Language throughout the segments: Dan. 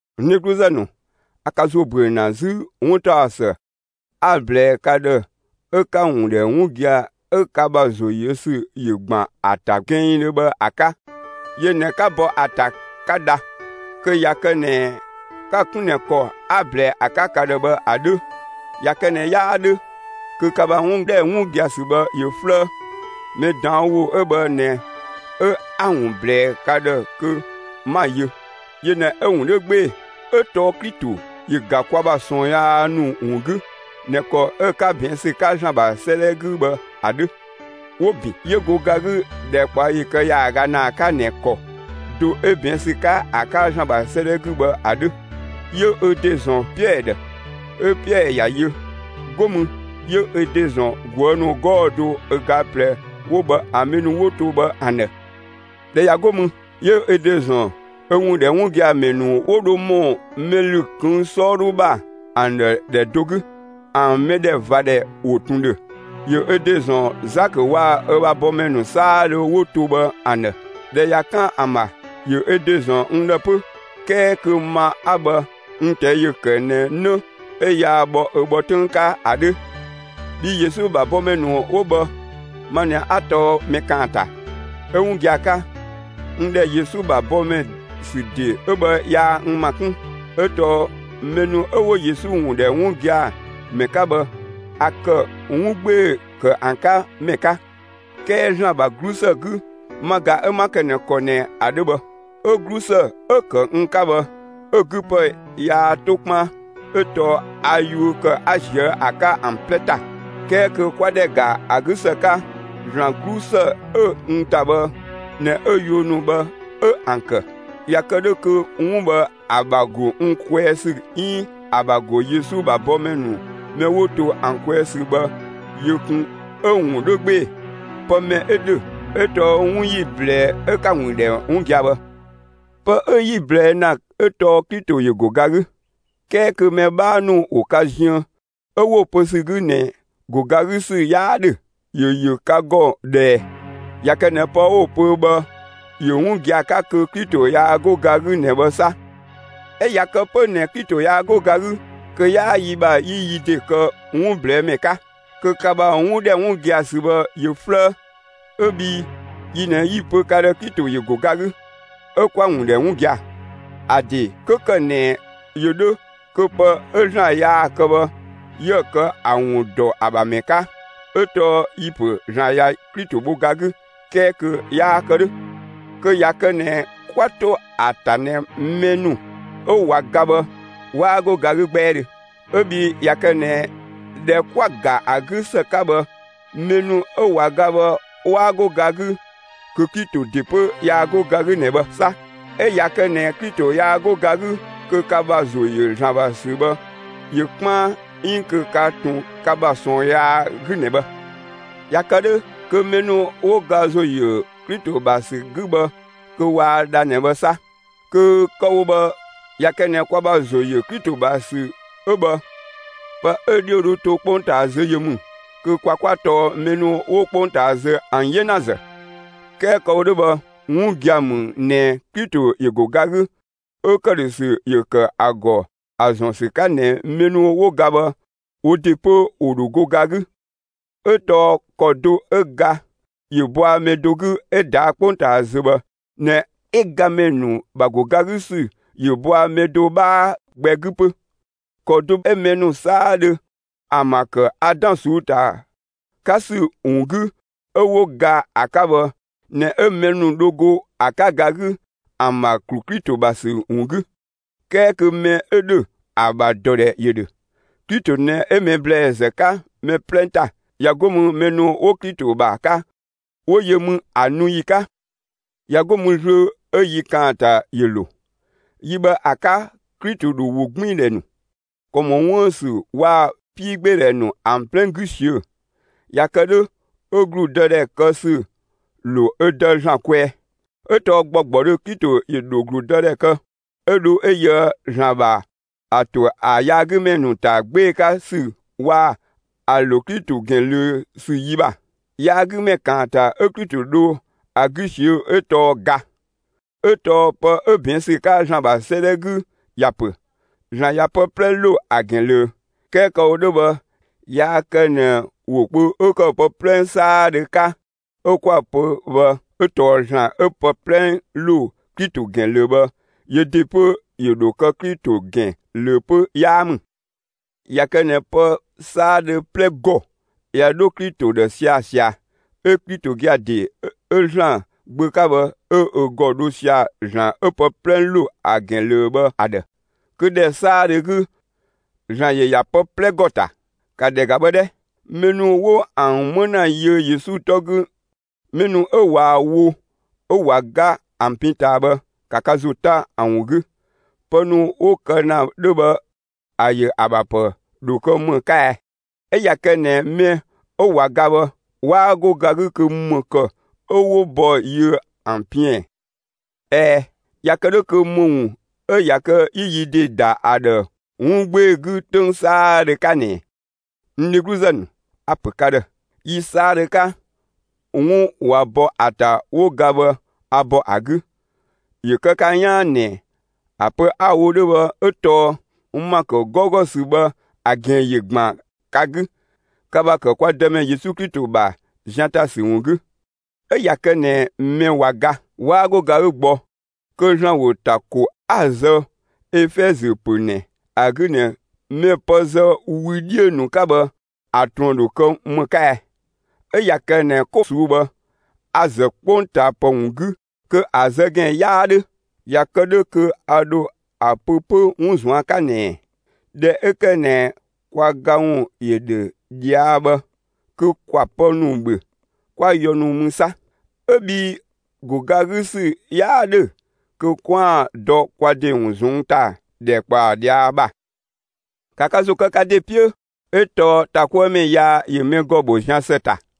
N dhegluzë ‑nu, a ka ‑zo ‑büö ‑na 'zü 'wuntaɔsë 'a‑ ꞊blɛɛ ka ‑dhë 'ö 'ka‑ ‑wun ‑dhɛ 'wun gia‑ 'ö ka ‑bha ‑zo yö ‑sü ‑yö ‑gban ‑a ‑ta gɛnngdhö bhë ‑a 'ka. Yö ꞊nɛ 'ka bɔ ‑a ‑ta 'ka dha, kö ꞊ya kë ꞊nɛ 'ka‑ 'kun ꞊nɛ ‑kɔ 'a‑ ꞊blɛɛ ‑a 'ka ka ‑dhë bhë ‑a 'dhö. ꞊Ya kë ꞊nɛ 'yaa 'dhö kö ka ‑bha 'wun ‑dhɛ 'wun gia‑ ‑sü bhë ‑yö 'flëë. Mɛ ꞊daan' ‑wo 'ö bhë ꞊nɛ 'ö 'a‑ ‑wun ꞊blɛɛ ka ‑dhë kö 'ma‑ yö; yö ꞊nɛ 'ö‑ ‑wun 'dhö 'gbee‑, 'ö tɔɔ Klito ‑yö ‑ga kwa ‑bha ꞊sɔɔn yaa ‑nu ‑wun 'gü ꞊nɛ ‑kɔ 'ö‑ 'ka ꞊bɛɛn' ‑sü 'ka ‑Zlan ‑bha 'sëëdhɛ 'gü bhë ‑a 'dhö. 'Wo‑ ‑bin; 'yö go ga 'gü ‑dhɛkpaɔyi kë ‑yaaga ‑naa 'ka ꞊nɛ ‑kɔ do 'ö ꞊bɛɛn' ‑sü 'ka ‑a 'ka ‑Zlan ‑bha 'sëëdhɛ 'gü bhë ‑a 'dhö; 'yö ö ‑de ‑zɔn Piɛɛ ‑dhë, 'ö Piɛɛ ‑ya yö; 'go mü 'yö ö ‑de ‑zɔn ꞊guë' ‑nu 'gɔɔ‑ do ö ga ꞊plɛ 'wo bhë ‑an mɛ ‑nu 'wo to bhë ‑an ‑dhë. ꞊Dhɛ ꞊ya 'go mü, 'yö ö ‑de ‑zɔn ö ‑wun ‑dhɛ 'wun gia‑ ‑mɛ ‑nu 'wo dho ‑mɔ mɛ ‑lü ꞊këng' 'sɔɔdhu ‑bha ‑an ‑dhë ‑dhɛ do 'gü. ‑An mɛdhɛvadhɛ ‑wo ꞊tun ‑dhö. ‑Yö ö ‑de ‑zɔn Zakö waa‑ ö ‑bha bɔmɛ ‑nu 'saadhö 'wo to bhë ‑an ‑dhë. ꞊Dhɛ ꞊ya 'kan ‑an ‑bha, ‑yö ö ‑de ‑zɔn n ‑dhë 'pö; 'kɛɛ kö ma 'a bhë n ꞊tɛi' ‑yö ‑kë ꞊nɛ 'në 'ö yaa bhɔ ö bhɔ 'töng 'ka ‑a 'dhö. Bhii Yesu ‑bha bɔmɛ ‑nu 'wo bhë ma ꞊nɛ 'a tɔɔ mɛ ‑kaanta, 'ö 'wun gia‑ 'ka, n ‑dhɛ Yesu ‑bha bɔmɛ ‑sü ‑de 'ö bhë yaa n ‑ma 'kun; 'ö tɔɔ mɛ ‑nu 'ö 'wo Yesu ‑wun ‑dhɛ 'wun gia‑ ‑mɛ 'ka bhë, a ‑kë 'wun 'gbee‑ ‑kë ‑an 'ka ‑mɛ 'ka. 'Kɛɛ ‑Zlan ‑bha 'glusë 'gü, ma ꞊ga 'ö 'ma kë ꞊nɛ ‑kɔ ꞊nɛ ‑a 'dhö bhë; 'ö 'glusë 'ö‑ ‑kë n 'ka bhë, 'ö‑ 'gü ‑pë yaa 'to 'kpaan. 'Ö tɔɔ a yuö ‑kë 'a ‑ziö ‑a 'ka ‑an 'plɛ ‑ta; 'kɛɛ kö kwa ‑dhɛ ‑ga ‑a 'gü ‑së 'ka, ‑Zlan 'glusë 'ö n ‑ta bhë ꞊nɛ 'ö yuö ‑nu bhë 'ö ‑an ‑kë. ꞊Ya kë 'dhö kö 'wun bhë ‑a ‑bha ‑go n kwɛɛ ‑sü 'iin ‑a ‑bha ‑go Yesu ‑bha bɔmɛ ‑nu mɛ 'wo to ‑an kwɛɛ ‑sü bhë yö kun 'ö‑ ‑wun 'dhö 'gbee‑. Pë mɛ 'ö ‑dhö 'ö tɔɔ 'wun 'yi‑ ꞊blɛɛ'‑ 'ö 'ka‑ ‑wun ‑dhɛ 'wun gia‑ bhë. Pë 'ö yi‑ ꞊blɛɛ' ‑na 'ö tɔɔ Klito ‑yö ‑go ga 'gü 'kɛɛ kö mɛ 'bhaa ‑nu ‑wo ka ziën 'ö 'wo‑ pö ‑sü 'gü ꞊nɛ ‑go ga 'gü ‑sü 'yaa ‑dhö, ‑yö ‑yö ka ‑gɔ ꞊dhë ꞊ɛ? ꞊Ya kë ꞊nɛ pë 'wo‑ pö bhë ‑yö 'wun gia‑ 'ka, kö Klito yaa 'go ga 'gü ꞊nɛ bhë 'sa! 'Ö ꞊ya kë 'pö ꞊nɛ Klito yaa 'go ga 'gü, kö 'yaa yi ‑bha 'yi yi ‑de kë 'wun ꞊blɛɛ'‑ ‑mɛ 'ka; kö ka ‑bha 'wun ‑dhɛ 'wun gia‑ ‑sü bhë ‑yö 'flëë ('ö bhii yi ꞊nɛ 'yi‑ pö ka ‑dhë Klito ‑yö ‑go ga 'gü, 'ö 'ka‑ ‑wun ‑dhɛ 'wun gia‑). ‑A ‑de 'kö ‑kë ꞊nɛ ‑yö 'dhö, kö pë 'ö ‑Zlan yaa‑ kë bhë, 'yië kë ‑a ‑wun ‑dɔ ‑a ‑bha ‑mɛ 'ka; 'ö tɔɔ yi‑ ‑pö ‑Zlan ꞊ya Klito bho ga 'gü 'kɛɛ kö yaa‑ kë 'dhö, kö ꞊ya kë ꞊nɛ 'kwa 'to ‑a ‑ta ꞊nɛ mɛ ‑nu 'ö ꞊wa ga bhë, 'waa 'go ga 'gü 'gbɛɛdhö. 'Ö bhii ꞊ya kë ꞊nɛ ‑dhɛ 'kwa‑ ‑ga ‑a 'gü ‑së 'ka bhë, mɛ ‑nu 'ö ꞊wa ga bhë 'waa 'go ga 'gü, kö Klito ‑de 'pö yaa 'go ga 'gü ꞊nɛ bhë 'sa. 'Ö ꞊ya kë ꞊nɛ Klito yaa 'go ga 'gü, kö ka ‑bha ‑zo ‑yö ‑Zlan ‑bha ‑sü bhë ‑yö 'kpaan, 'iin kö ka ꞊tun ka ‑bha ꞊sɔɔn yaa 'gü ꞊nɛ bhë. ꞊Ya kë 'dhö, kö mɛ ‑nu 'wo ga ‑zo ‑yö Klito ‑bha ‑sü 'gü bhë kö waa dha ꞊nɛ bhë 'sa! Kö kë‑ wo bhë, ꞊ya kë ꞊nɛ kwa ‑bha ‑zo ‑yö Klito ‑bha ‑sü 'ö bhë, pë 'ö‑ 'dhiö dho to 'kpongtaa zö yö ‑mü, kö kwa 'kwa tɔɔ mɛ ‑nu 'wo 'kpongtaa zö ‑an 'yenazë. 'Kɛɛ kë‑ wo 'dhö bhë, 'wun gia‑ ‑mü ꞊nɛ Klito ‑yö ‑go ga 'gü, 'ö ‑këdhösü ‑yö ‑kë ‑a ‑gɔ ‑a ‑zɔn ‑sü 'ka ꞊nɛ mɛ ‑nu 'wo ga bhë, wo ‑de 'pö ‑wo ‑dho go ga 'gü. 'Ö tɔɔ ‑kɔ do 'ö ga ‑yö bɔa mɛ do 'gü 'ö ꞊daa' 'kpongtaa zö bhë ꞊nɛ 'ö gamɛ ‑nu ‑bha ‑go ga 'gü ‑sü ‑yö bɔa mɛ do 'bhaa gbɛ 'gü 'pö. ‑Kɔ do 'ö mɛ ‑nu 'saadhö ‑an ‑bha ‑kë Adan ꞊suu'‑ 'ka ‑sü ‑wun 'gü, 'ö 'wo ga ‑a 'ka bhë ꞊nɛ 'ö mɛ ‑nu dho go ‑a 'ka ga 'gü ‑an ‑bha ‑klu Klito ‑bha ‑sü ‑wun 'gü. 'Kɛɛ kö mɛ 'ö ‑dhö, ‑a ‑bha ‑dɔdhɛ ‑yö ‑dhö. Klito ꞊nɛ 'ö mɛ ‑blɛɛzë 'ka mɛ 'plɛ ‑ta; ꞊ya 'go mü, mɛ ‑nu 'wo Klito ‑bha 'ka, 'wo yö mü ‑a nu ‑yi 'ka. ꞊Ya 'go mü zlöö 'ö yi ‑kaanta ‑yö ‑lo. Yi bhë ‑a 'ka, Klito ‑dho ‑wogbiindhɛ ‑nu, ‑kɔ ‑mɔ 'wuën‑ ‑sü waa‑ 'piigbeedhɛ ‑nu ‑an 'plɛ 'gü ꞊siö'‑. ꞊Ya kë 'dhö, 'ö ‑gludëdhɛ kë ‑sü ‑lo ö Dë ‑Zlan kwɛɛ. 'Ö tɔɔ ‑gbɔgbɔdhö Klito ‑yö ‑dhö ‑gludëdhɛ kë 'ö dho 'ö yöë ‑Zlan ‑bha ‑a ‑to ‑a yaagümɛ ‑nu ‑ta 'gbee‑ 'ka ‑sü, waa‑ ‑an ‑lo Klito ‑gɛn ꞊löö ‑sü ‑yi ‑bha. Yaagümɛ ‑kaanta 'ö Klito dho ‑a 'gü ꞊siö'‑ 'ö tɔɔ ga. 'Ö tɔɔ pë 'ö ꞊bɛɛn' ‑sü 'ka ‑Zlan ‑bha 'sëëdhɛ 'gü ‑ya ‑pö: ‑Zlan ꞊ya pë 'plɛ ‑lo ‑a ‑gɛn ꞊löö. 'Kɛɛ kë‑ wo 'dhö bhë yaa kë ꞊nɛ ‑wo kpö 'ö ‑kë «pë 'plɛ 'saadhö» 'ka, 'ö 'kwa‑ pö bhë 'ö tɔɔ ‑Zlan 'ö pë 'plɛ ‑lo Klito ‑gɛn ꞊löö bhë, yö ‑de 'pö ‑yö ‑dho kë Klito ‑gɛn ꞊löö 'pö 'yaa ‑mü. ꞊Ya kë ꞊nɛ pë 'saadhö 'plɛ ‑gɔ ꞊ya 'dho Klito ‑dhë sia‑ ꞊sia, 'ö Klito gia‑ ‑de 'ö ‑Zlan Gbö 'ka bhë, 'ö ö ‑gɔ dho sia‑ ‑Zlan 'ö pë 'plɛ ‑lo ‑a ‑gɛn ꞊löö bhë ‑a ‑dhë; kö ‑dhɛ 'saadhö 'gü ‑Zlan ‑yö ‑ya pë 'plɛ ‑gɔ ‑ta. ‑Ka ‑dhɛ ‑ga bhë 'dhɛ! Mɛ ‑nu 'wo ‑an 'më ‑na yiö Yesu 'tɔ 'gü mɛ ‑nu 'ö ꞊waa‑ wo 'ö ꞊wa ga ‑an pin ꞊taa bhë, ‑ka ka ‑zo 'ta ‑an ‑wun 'gü! Pë ‑nu 'wo‑ kë ‑na 'dhö bhë ‑a ‑yö ‑a ‑bha ‑pë ‑dho kë ‑më 'ka ɛɛ? 'Ö ꞊ya kë ꞊nɛ mɛ 'ö ꞊wa ga bhë 'waa go ga 'gü kö ‑më ‑kë 'ö 'wo bɔ yiö ‑an piën ꞊ɛɛn? ꞊Ɛɛ, ꞊ya kë 'dhö kö ‑më ‑wun 'ö ꞊ya kë 'yi yi ‑de ‑da ‑a ‑dhë 'wun 'gbee‑ 'gü 'töng 'saadhö 'ka ꞊nɛɛ? N dhegluzë ‑nu, a‑ ‑pö ka ‑dhë, yi 'saadhö 'ka, 'wun ꞊wa bɔ ‑a ‑ta 'wo ga bhë, a ‑bɔ ‑a 'gü; (‑yö kë ka 'yaan ꞊nɛ,) ‑a pö 'a‑ wo 'dhö bhë 'ö tɔɔ n ‑ma ‑kë 'gɔugɔ ‑sü bhë ‑a ‑gɛn ‑yö ‑gban ka 'gü, ka ‑bha ‑kë kwa Dëmɛ Yesu Klito ‑bha zian ‑ta ‑sü ‑wun 'gü. 'Ö ꞊ya kë ꞊nɛ mɛ ꞊wa ga, 'waa 'go ga 'gü gbɔ, kö ‑Zlan ‑wo ‑ta ‑ko 'a‑ zë Efɛzö ‑pö ꞊nɛ ‑a 'gü ꞊nɛ mɛ pë zë wü 'dhiö ‑nu 'ka bhë, ‑a ꞊truën ‑dho kë ‑më 'ka ɛɛ? 'Ö ꞊ya kë ꞊nɛ 'ko ꞊suu'‑ bhë, a‑ ‑zë 'kpongtaapë ‑wun 'gü kö ‑a zë ‑gɛn 'yaa 'dhö. ꞊Ya kë 'dhö kö a ‑dho ‑a pö 'pö 'wun ꞊zuan' 'ka ꞊nɛɛ: «꞊Dhɛ 'ö ‑kë ꞊nɛ kwa ga ‑wun ‑yö ‑dhö ꞊dhia' bhë, kö ‑kwa pë ‑nu ‑bhö, 'kwa yɔ ‑nu mü 'sa!» ('Ö bhii ‑go ga 'gü ‑sü 'yaa 'dhö kö 'kwaan‑ dɔ kwa ‑de ‑wun ꞊zɔnng' ‑ta ‑dhɛkpaɔ ꞊dhia' ‑bha.) ‑Ka ka ‑zo kë ka ‑de 'piö, 'ö tɔɔ ‑ta 'kuë ‑mɛ yaa ‑yö mɛ ‑gɔ bho zian ‑së ‑ta.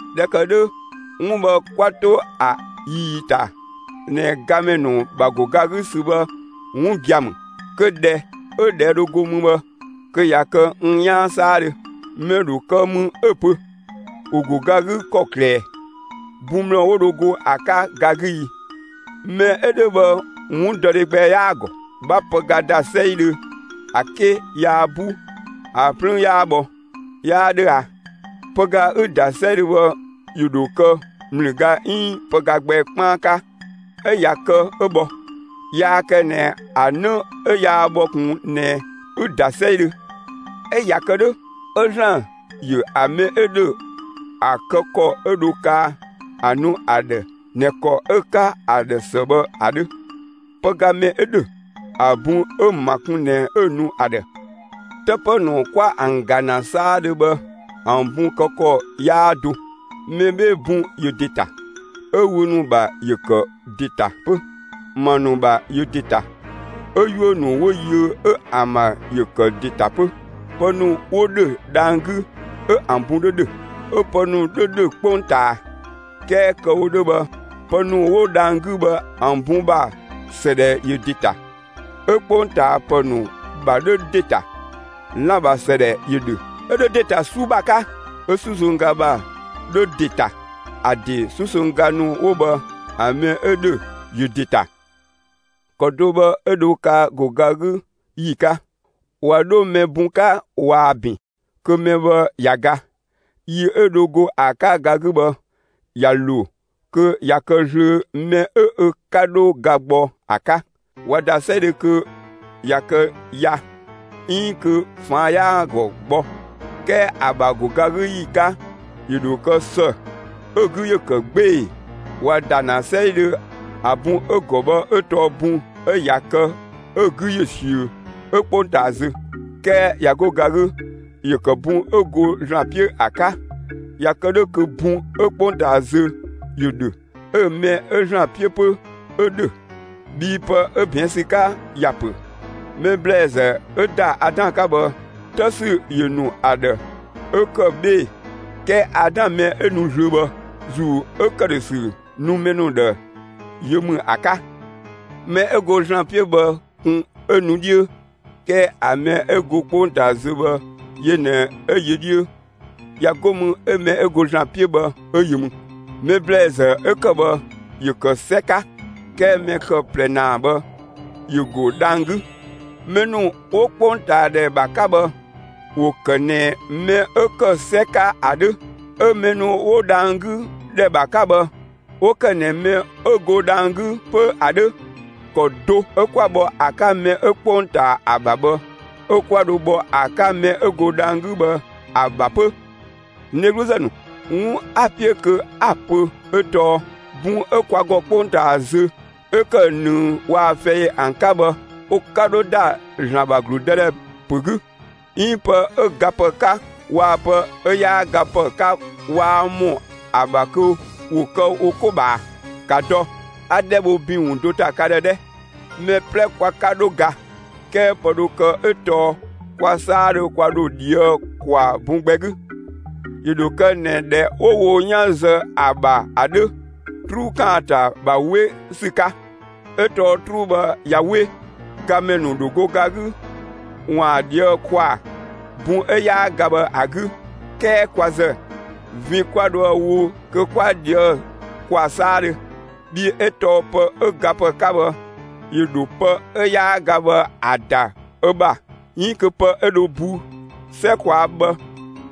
꞊Dhɛ ‑kë 'dhö, 'wun bhë 'kwa 'to ‑a ꞊ii ‑ta ꞊nɛ gamɛ ‑nu ‑bha ‑go ga 'gü ‑sü bhë 'wun gia‑ ‑mü, kö ꞊dhɛ 'ö ꞊dhɛɛ' dho go mü bhë, kö ꞊ya kë n 'yaan 'saadhö. Mɛ ‑dho kë mü 'ö‑ pö: «‑Wo ‑go ga 'gü ‑kɔklë ꞊ɛ? Bun ‑mlë 'wo dho go ‑a 'ka ga 'gü i?» Mɛ 'ö 'dhö bhë 'wundɔdhe gbɛ 'yaa‑ ‑gɔ. 'Bha pëga ‑da 'sɛidhö, ‑a 'ke yaa 'bu, ‑a 'plüün 'yaa bhɔ, 'yaa 'dhö a? Pëga 'ü‑ ‑da 'sɛidhö bhë, ‑yö ‑dho kë ‑mlüga 'iin pëga gbɛ 'kpaan 'ka, 'ö ꞊ya kë 'ö bhɔ; yaa kë ꞊nɛ ‑a 'në 'ö yaa bhɔ ꞊kun ꞊nɛ ü‑ ‑da 'sɛidhö. 'Ö ꞊ya kë 'dhö 'ö ‑Zlan ‑yö ‑a mɛ 'ö ‑dhö ‑a kë ‑kɔ 'ö dho kaa ‑a ‑nu ‑a ‑dhë ꞊nɛ ‑kɔ 'ö‑ 'ka ‑a ‑dhë ‑së bhë ‑a 'dhö. Pëga mɛ 'ö ‑dhö, ‑a bun 'ö‑ ‑ma kun ꞊nɛ 'ö‑ nu ‑a ‑dhë. 'Të ‑pë ‑nu 'kwa ‑an ‑ga ‑na 'saadhö bhë ‑an bun kë ‑kɔ 'yaa do. Mɛ 'bhee‑ bun ‑yö ‑de ‑ta, 'ö wü ‑nu ‑bha ‑yö ‑kë ‑de ‑ta 'pö; ‑ma ‑nu ‑bha ‑yö ‑de ‑ta, 'ö 'yuö‑ ‑nu 'wo yiö 'ö ‑an ‑bha ‑yö ‑kë ‑de ‑ta 'pö. Pë ‑nu ‑wo ‑dhö dhang‑ 'gü, 'ö ‑an bun 'dhö ‑dhö, 'ö pë ‑nu 'dhö ‑dhö 'kpongtaa. 'Kɛɛ kë‑ wo 'dhö bhë pë ‑nu 'wo dhang‑ 'gü bhë ‑an bun ‑bha ‑sëdhɛ ‑yö ‑de ‑ta; 'ö 'kpongtaapë ‑nu ‑bha 'dhö ‑de ‑ta. Lan‑ ‑bha ‑sëdhɛ ‑yö ‑dhö, 'ö 'dhö ‑de ‑ta 'sü ‑zë 'ka. 'Ö 'susongga ‑bha 'dhö ‑de ‑ta; ‑a ‑de 'susongga ‑nu 'wo bhë, ‑a mɛ 'ö ‑dhö ‑yö ‑de ‑ta. ‑Kɔ do bhë 'ö dho kaa ‑go ga 'gü ‑yi 'ka. ꞊Wa 'dho mɛ bun 'ka ꞊waa‑ ‑bin, kö mɛ bhë ꞊ya ga; yi 'ö dho go ‑a 'ka ga 'gü bhë ꞊ya ‑lo, kö ꞊ya kë zlöö mɛ 'ö ö 'ka 'dho ga gbɔ ‑a 'ka. ‑Wa ‑da 'sɛidhö kö ꞊ya kë ya 'iin kö ꞊faan' 'yaa‑ ‑gɔ gbɔ. 'Kɛɛ ‑a ‑bha ‑go ga 'gü ‑yi 'ka, ‑yö ‑dho kë ‑së 'ö‑ 'gü ‑yö ‑kë 'gbee‑. ‑Wa ‑da ‑na 'sɛidhö ‑a bun 'ö‑ ‑gɔ bhë 'ö tɔɔ bun 'ö ꞊ya kë 'ö‑ 'gü ‑yö ꞊siö'‑, 'ö 'kpongtaa zö. 'Kɛɛ ꞊ya 'go ga 'gü, ‑yö ‑kë bun 'ö go ‑Zlan 'piö ‑a 'ka. ꞊Ya kë 'dhö kö bun 'ö 'kpongtaa zö, ‑yö ‑dhö, 'ö‑ mɛ 'ö ‑Zlan 'piö 'pö, 'ö ‑dhö. Bhii pë 'ö ꞊bɛɛn' ‑sü 'ka ‑ya ‑pö: Mɛ ‑blɛɛzë 'ö ‑da Adan 'ka bhë, 'të ‑sü ‑yö ‑nu ‑a ‑dhë 'ö ‑kë 'bhee‑. 'Kɛɛ Adan mɛ 'ö nu zlöö bhë, ‑Zuu 'ö ‑këdhösü nu mɛ ‑nu ‑dhë, yö ‑mü ‑a 'ka. Mɛ 'ö go ‑Zlan 'piö bhë kun 'ö nu 'dhiö, 'kɛɛ ‑a mɛ 'ö go 'kpongtaa zö bhë yö ꞊nɛ 'ö yö 'dhiö; ꞊ya 'go mü 'ö mɛ 'ö go ‑Zlan 'piö bhë 'ö yö ‑mü. Mɛ ‑blɛɛzë 'ö ‑kë bhë ‑yö ‑kë 'sɛ 'ka, 'kɛɛ mɛ kë ꞊plɛ ‑naa bhë ‑yö ‑go dhang‑ 'gü. Mɛ ‑nu 'wo 'kpongtaadhɛ ‑bha 'ka bhë ‑wo ‑kë ꞊nɛ mɛ 'ö ‑kë 'sɛ 'ka ‑a 'dhö. 'Ö‑ mɛ ‑nu 'wo dhang‑ 'gü ‑dhɛ ‑bha 'ka bhë, 'wo ‑kë ꞊nɛ mɛ 'ö go dhang‑ 'gü 'pö ‑a 'dhö. ‑Kɔ do 'ö 'kwa bhɔ ‑a 'ka mɛ 'ö 'kpongtaa ‑a ‑bha bhë, 'ö 'kwa dho bhɔ ‑a 'ka mɛ 'ö go dhang‑ 'gü bhë ‑a ‑bha 'pö. N dhegluzë ‑nu, 'wun 'a‑ 'piö kö 'a‑ pö 'ö tɔɔ: Bun 'ö kwa ‑gɔ 'kpongtaa zö 'ö ‑kë ꞊nëng waa‑ fɛi ‑an 'ka bhë, ö 'ka 'dho ‑da ‑Zlan ‑bha ‑gludëdhɛ ‑pö 'gü; 'iin pë 'ö gapë 'ka waa‑ pë 'ö 'yaa gapë 'ka waa ‑mɔ ‑a ‑bha kö ‑wo kë wo 'ko ꞊bhaa. ‑Ka dɔ, 'a 'dhɛ bho ‑bin ‑wun do ‑ta ka ‑dhë 'dhɛ: Mɛ 'plɛ kwa 'ka 'dho ga; 'kɛɛ pë dho kë 'ö tɔɔ kwa 'saadhö kwa ‑dho ꞊dhië' ‑kwaa bun gbɛ 'gü. ‑Yö ‑dho kë ꞊nɛ ‑dhɛ 'wo wo 'yan zë ‑a ‑bha ‑a 'dhö, 'truu ‑kaanta ‑bha 'we ‑sü 'ka. 'Ö tɔɔ 'truu bhë ꞊ya 'we, gamɛ ‑nu ‑dho go ga 'gü, ‑waan ꞊dhië'‑ ‑kwaa bun 'ö 'yaa ga bhë ‑a 'gü; 'kɛɛ kwa ‑zë, vin 'kwa dhoë‑ wo kö 'kwa ꞊dhië' ‑kwaa 'saadhö. Bhii 'ö tɔɔ pë 'ö gapë 'ka bhë, ‑yö ‑dho pë 'ö 'yaa ga bhë ‑a ‑da ö ‑bha 'iin kö pë 'ö dho bu 'sɛ ꞊kwaa' bhë,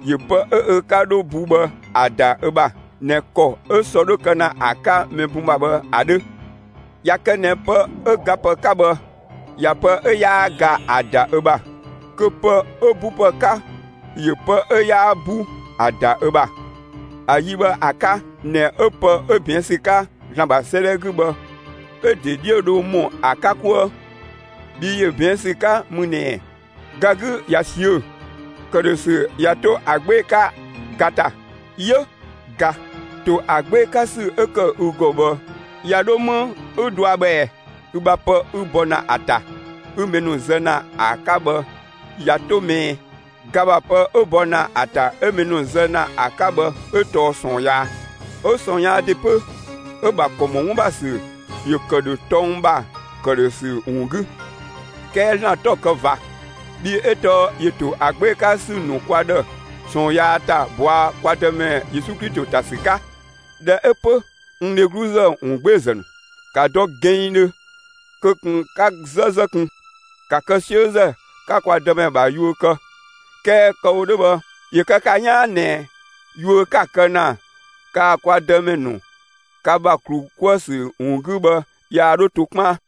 ‑yö pë 'ö ö 'ka 'dho bu bhë ‑a ‑da ö ‑bha (꞊nɛ ‑kɔ 'ö sɔ 'dhö kë ‑na ‑a 'ka mɛ bun ‑bha bhë ‑a 'dhö). ꞊Ya kë ꞊nɛ pë 'ö gapë 'ka bhë ꞊ya pë 'ö 'yaa ga ‑a ‑da ö ‑bha, kö pë 'ö 'bupë 'ka ‑yö pë 'ö 'yaa 'bu ‑a ‑da ö ‑bha, ‑a yi bhë ‑a 'ka ꞊nɛ 'ö pë 'ö ꞊bɛɛn' ‑sü 'ka ‑Zlan ‑bha 'sëëdhɛ 'gü bhë 'ö‑ ‑de 'dhiö dho ‑mɔ ‑a 'ka 'kuë. Bhii ‑yö ꞊bɛɛn' ‑sü 'ka mü ꞊nɛ: Ga 'gü ꞊ya ꞊siö'‑; ‑këdhösü ꞊ya 'to ‑a 'gbee‑ 'ka ga ‑ta. 'Yö, ga, ‑to ‑a 'gbee‑ 'ka ‑sü 'ö ‑kë ü ‑gɔ bhë ꞊ya dho 'më 'ü dɔa bhë ꞊ɛ? Ü ‑bha pë 'ü bɔ ‑na ‑a ‑ta 'ü mɛ ‑nu zë ‑na ‑a 'ka bhë ꞊ya 'to 'më ꞊ɛ? Ga ‑bha pë 'ö bɔ ‑na ‑a ‑ta 'ö mɛ ‑nu zë ‑na ‑a 'ka bhë 'ö tɔɔ ꞊sɔɔn yaa. 'Ö ꞊sɔɔn yaa ‑de 'pö, 'ö‑ ‑bha ‑kɔ ‑mɔ 'wun ‑bha ‑sü ‑yö ‑kë ‑dhö tɔng ‑bha ‑këdhösü ‑wun 'gü. 'Kɛɛ ‑Zlan 'tɔ‑ kë ꞊va, bhii 'ö tɔɔ ‑yö ‑to ‑a 'gbee‑ 'ka ‑sü ‑nu kwa ‑dhë ꞊sɔɔn yaa ‑ta ꞊bɔa' kwa Dëmɛ Yesu Klito ‑ta ‑sü 'ka. ꞊Dhɛ 'ö 'pö, n dheglu ‑wungbeezë ‑nu, ‑ka dɔ gɛnngdhö, kö ꞊kun 'ka 'zëzë kun! ‑Ka kë 'siözë, 'ka kwa Dëmɛ ‑bha yuö kë! 'Kɛɛ kë‑ wo 'dhö bhë, ‑yö kë ka 'yaan ꞊nɛ yuö 'ka‑ kë ‑na kaa‑ kwa Dëmɛ ‑nu ka ‑bha ‑klu 'kuë‑ ‑sü ‑wun 'gü bhë, yaa 'dho to 'kpaan.